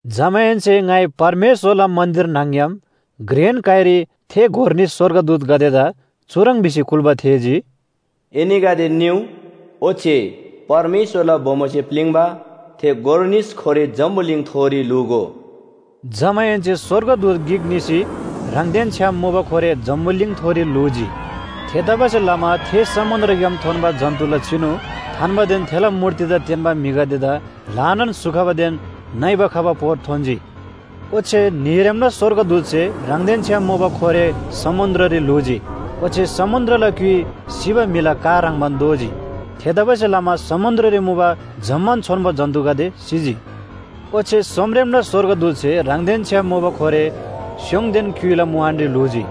जमाहेन्‍से ङाइ परमेश्‍वरला मन्‍दिर न्‍हङ‍ग्‍याम घ्रेन काइरी थे गोर निस स्‍वर्गदूतगदेदा चुह्रङ् भिसी कुल्‍बा थेःजी, “एनीगदे निउ, ओच्‍छे परमेश्‍वरला बोमोसे प्‍लिङ्बा थे गोर निस खोरे जम्‍बुलिङथोरी ल्‍हूगो।” जमाहेन्‍से स्‍वर्गदूत गिक निसी ह्राङदेन छ्‌याम मुबा खोरे जम्‍बुलिङथोरी ल्‍हूजी। थेतबासेलमा थे समुन्‍द्रग्‍याम थोन्‍बा जन्‍तुला चिनु थान्‍बादेन थेला मूर्तिदा तेन्‍बा म्‍हिगदेदा ल्‍हानान स्‍हु खबादेन नइबा खबा पोर थोन्‍जी। ओच्‍छे न्‍हीरेमला स्‍वर्गदूतसे ह्राङदेन छ्‌याम मुबा खोरे समुन्‍द्ररी ल्‍हूजी। ओच्‍छे समुन्‍द्रला क्‍युइ सिबा म्‍हिला का ह्रङ्‌बान दोजी। थेतबासेलमा समुन्‍द्ररी मुबा जम्‍मान छोन्‍बो जन्‍तुगदे सिजी। ओच्‍छे सोमरेमला स्‍वर्गदूतसे ह्राङदेन छ्‌याम मुबा खोरे स्‍योङदेन क्‍युइला मुहानरी ल्‍हूजी।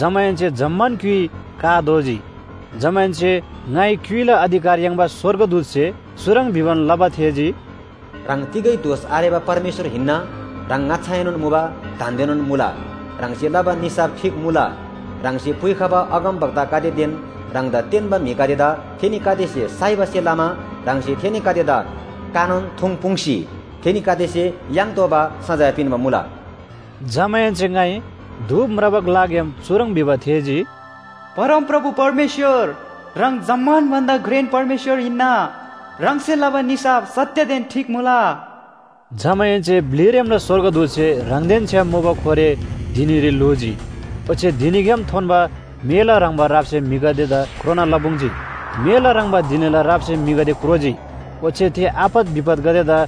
जमाहेन्‍से जम्‍मान क्‍युइ का दोजी। जमाहेन्‍से ङाइ क्‍युइला अधिकार याङ्बा स्‍वर्गदूतसे चुह्रङ् भिबान लबा थेःजी, “ह्राङ तिगै दोष आरेबा परमेश्‍वर हिन्‍ना, ह्राङ ङाच्‍छाएनोन मुबा, दान्‍देनोन मुला। ह्राङसे लबा निसाफ ठीक मुला। ह्राङसे पुइखबा अगमवक्तागदेदेन ह्राङदा तेन्‍बा म्‍हिगदेदा थेनीगदेसे साइबासे लमा ह्राङसे थेनीगदेदा कानोन थुङ्‌पुङ्‌सी थेनीगदेसे याङ्तोःबा सजाय पिन्‍बा मुला।” जमाहेन्‍से ङाइ धूप म्राबा ग्‍लाग्‍याम चुह्रङ् भिबा थेःजी, “परमप्रभु परमेश्‍वर, ह्राङ जम्‍मान भन्‍दा घ्रेन परमेश्‍वर हिन्‍ना, ह्राङसे लबा निसाफ सत्‍यदेन ठीक मुला।” जमाहेन्‍से ब्‍लिरेमला स्‍वर्गदूतसे ह्राङदेन छ्‌याम मुबा खोरे धिनीरी ल्‍हूजी। ओच्‍छे धिनीग्‍याम थोन्‍बा मेला ह्रङ्‌बा रापसे म्‍हिगदेदा क्रोना लपुङ्‌जी। मेला ह्रङ्‌बा धिनीला रापसे म्‍हिगदे क्रोजी, ओच्‍छे थे आपत विपतगदेदा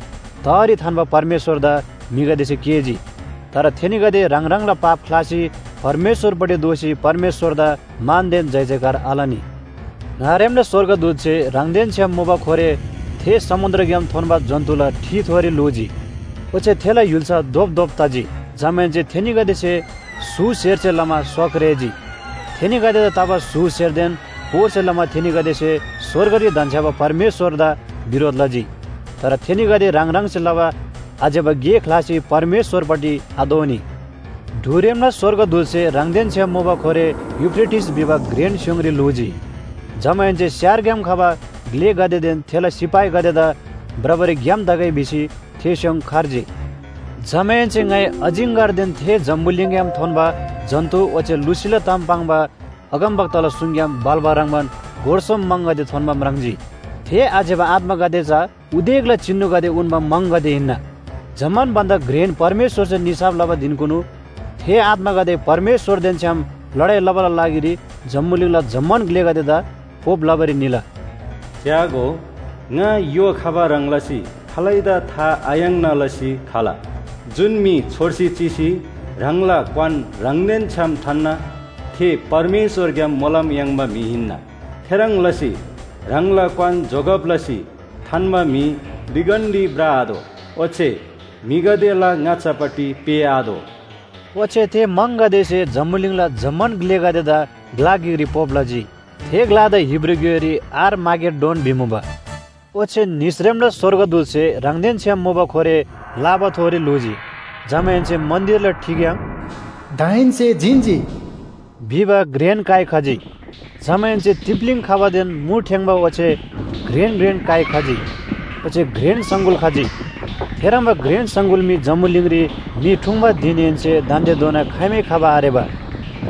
तहरी थान्‍बा परमेश्‍वरदा म्‍हिगदेसे केःजी। तर थेनीगदे ह्राङ ह्राङला पाप ख्‍लासी परमेश्‍वरपट्टि दोःसी परमेश्‍वरदा मानदेन जयजयकार आलनी। ङारेमला स्‍वर्गदूतसे ह्राङदेन छ्‌याम मुबा खोरे थे समुन्‍द्रग्‍याम थोन्‍बा जन्‍तुला ठिथोरी ल्‍हूजी। ओच्‍छे थेला य्‍हुल्‍सा धोपधोप तजी। जमाहेन्‍से थेनीगदेसे स्‍हु स्‍हेरसे लमा स्‍वा क्रेजी। थेनीगदेदा तबा स्‍हु स्‍हेरदेन पोरसे लमा थेनीगदेसे स्‍वर्गरी धन्‍छ्‌याबा परमेश्‍वरदा बिरोध लजी। तर थेनीगदे ह्राङ ह्राङसे लबा आज्‍यबा गे ख्‍लासी परमेश्‍वरपट्टि आदोःनी। ढुरेमला स्‍वर्गदूतसे ह्राङदेन छ्‌याम मुबा खोरे यूफ्रेटिस भिबा घ्रेन स्‍योङरी ल्‍हूजी। जमाहेन्‍से स्‍यारग्‍याम खबा ग्‍लेगदेदेन थेला सिपाहीगदेदा भ्रबारी ग्‍याम तगै भिसी थे स्‍योङ खर्जी। जमाहेन्‍से ङाइ अजिङ्‍गरदेन थे जम्‍बुलिङग्‍याम थोन्‍बा जन्‍तु ओच्‍छे लुसीला ताम पाङ्बा अगमवक्ताला सुङग्‍याम भाल्‍बा ह्रङ्‌बान गोर सोम म्‍हङगदे थोन्‍बा म्राङ्जी। थे आज्‍यबा आत्‍मागदे चा उदेकला चिनुगदे उन्‍बा म्‍हङगदे हिन्‍ना। जम्‍मान भन्‍दा घ्रेन परमेश्‍वरसे निसाफ लबा धिनकुनु थे आत्‍मागदे परमेश्‍वरदेन छ्‌याम लडाइ लबाला लागिरी जम्‍बुलिङला जम्‍मान ग्‍लेगदेदा पोप लबारी निला। “च्‍यागो, ङा य्‍हो खबा ह्रङ् लसी खालैदा था आयाङ्ना लसी खला। जुन म्‍हि छोर्सी चिसी ह्राङला क्‍वान ह्राङदेन छ्‌याम थान्‍ना थे परमेश्‍वरग्‍याम मोलम याङ्बा म्‍हि हिन्‍ना। थेह्रङ् लसी ह्राङला क्‍वान जोगब लसी थान्‍बा म्‍हि लिगन्‍डी भ्रआतोः। ओच्‍छे म्‍हिगदेला ङाच्‍छापट्टि पेःआतोः।” ओच्‍छे थे म्‍हङगदेसे जम्‍बुलिङला जम्‍मान ग्‍लेगदेदा ग्‍ला गिकरी पोप लजी। थे ग्‍लादा हिब्रू ग्‍योइरी आर-मागेड्डोन भिमुबा। ओच्‍छे निसरेमला स्‍वर्गदूतसे ह्राङदेन छ्‌याम मुबा खोरे लाबाथोरी ल्‍हूजी। जमाहेन्‍से मन्‍दिरला ठिग्‍याम “दाहेन्‍से जिन्‍जी” भिबा घ्रेन काइ खजी। जमाहेन्‍से तिप्‍लीङ खबादेन मु ठेङ्‌बा ओच्‍छे घ्रेन घ्रेन काइ खजी, ओच्‍छे घ्रेन सङगुल खजी। थेह्रङ्बा घ्रेन सङगुल मी जम्‍बुलिङरी म्‍हि ठुङ्‌बा धिनहेन्‍से दान्‍देधोना खाइमै खबा आरेबा।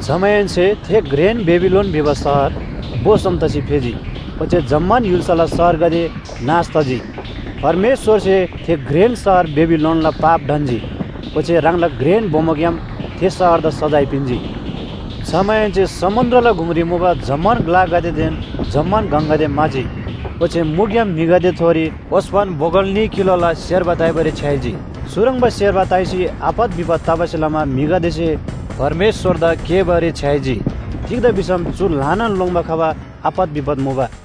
जमाहेन्‍से थे घ्रेन बेबिलोन भिबा शहर भो सोम तसी फेजी, ओच्‍छे जम्‍मान य्‍हुल्‍साला शहरगदे नाश तजी। परमेश्‍वरसे थे घ्रेन शहर बेबिलोनला पाप ढन्‍जी, ओच्‍छे ह्राङला घ्रेन बोमोग्‍याम थे शहरदा सजाय पिन्‍जी। जमाहेन्‍से समुन्‍द्रला गुङरी मुबा जम्‍मान ग्‍लागदेदेन जम्‍मान गङगदे म्‍हाजी। ओच्‍छे मुग्‍याम म्‍हिगदेथोरी ओस्‍पन बोगल न्‍ही किलोला सेर्बा ताइबारी छ्‌याइजी। चुह्रङ्बा सेर्बा ताइसी आपत विपत तबासे लमा म्‍हिगदेसे परमेश्‍वरदा केःबारी छ्‌याइजी। तिग्‍दा भिसम चु ल्‍हानान लोङ्‌बा खबा आपत विपत मुबा।